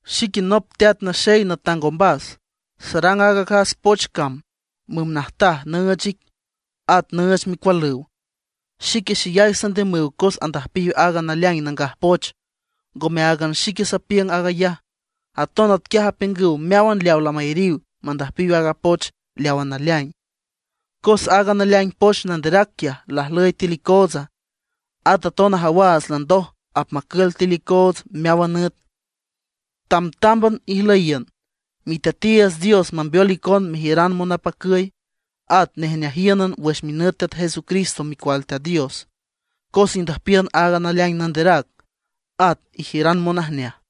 Xique nop teat naxey natang ombas; sarang aaga acas poch cam, müm najtaj, nüüch ic, at nüüch micualüw. Xique xeyay sandiümüw cos andüjpiw aaga naleaing nangaj poch. Ngome áagan xique sapiüng aag ayaj, aton atquiaj apiüngüw meáwan leawa lamayariw mandüjpiw aaga poch leawa naleaing. Cos aaga naleaing poch nanderac quiaj lajlüy tiül icootsa, at aton ajawaats landoj apmacül tiül icoots meáwan nüt. Tamtámban ijlüyiün, Miteatiiüts Dios mambeol icon mejiüran monapacüy, at nejneajíünan wüx minüt Teat Jesucristo Micual Teat Dios; cos indüjpiün aaga naleaing nanderac, at ijiüran monajneaj.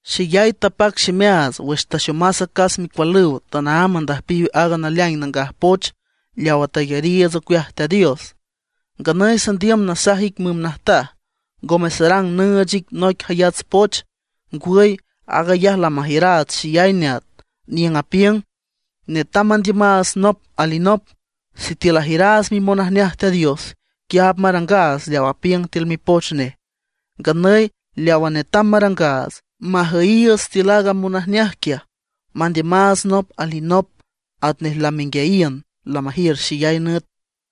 Xeyay tapac ximeaats wüx taxomas acas micualüw tanaámb andüjpiw aaga naleaing nangaj poch leawa tayariiüts ocueaj Teat Dios. Nganüy sandiüm nasaj ic müm najtaj, ngome sarang nüüch ic noic jayats poch. Ngwüy, aag ayaj lamajiüraats xeyay neat, niüng apiüng: Netam mandiümaats nop alinop. Sitiül ajiüraats mimonajneaj Teat Dios, quiaj apmarangaats leaw apiüng tiül Mipoch Nej. Nganüy leawa netam marangaats: majüyiiüts tiül aaga monajneaj quiaj, mandiümaats nop alinop atnej lamenguiayiün lamajiür xeyay nüt.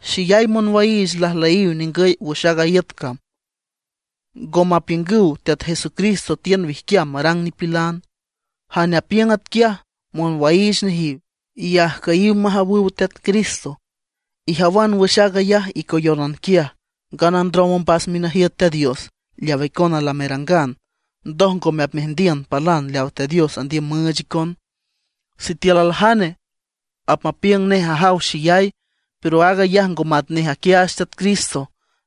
Xeyay monwaiich lajlüyiw ningüy wüx aaga iüt cam, ngo mapiüngüw Teat Jesucristo tiün wijquiam marang nipilan. Jane apiüng atquiaj, monwaiich nejiw, y ajcüyiw majawüw Teat Cristo. Ijawan wüx aag ayaj icoyónan quiaj, ngana ndrom ombas minajiüt Teat Dios leaw icona lamerangan, ndoj ngome apmeajndiün palan leaw Teat Dios andiüm müüch icon. Sitiül aljane apmapiüng nej ajaw xeyay, pero aag ayaj ngo matnej aquiaach Teat Cristo,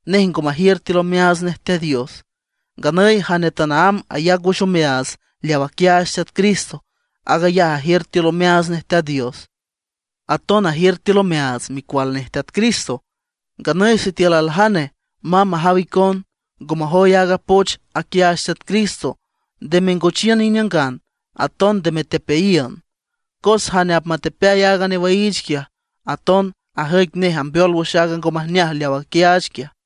nej ngo majiür tiül omeaats nej Teat Dios. Nganüy jane tanaámb ayac wüx omeaats leaw aquiaach Teat Cristo, aag ayaj ajiür tiül omeaats nej Teat Dios, aton ajiür tiül omeaats Micual nej Teat Cristo. Nganüy sitiül aljane mamb majaw icon, ngo majoy aaga poch aquiaach Teat Cristo, nde mengochiün iniüngan, aton nde metepeayiün. Cos jane apmatepeay aaga newaiich quiaj, aton ajüic nej ambeol wüx aaga ngo majneaj leaw aquiaach quiaj.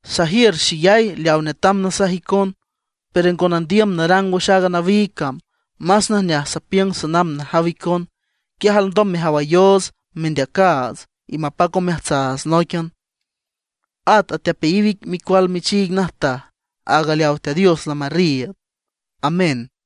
Sajiür xeyay leaw netam nasaj icon, pero ngo nandiüm narang wüx aaga nawiig cam, más najneaj sapiüng sanamb najaw icon, quiaj alndom mejawayoots mendeacaats, y mapac omeajtsaats nóiquian. At atepeayiw ic micual michiig najtaj, áag leaw Teat Dios lamarriiüd. Amén.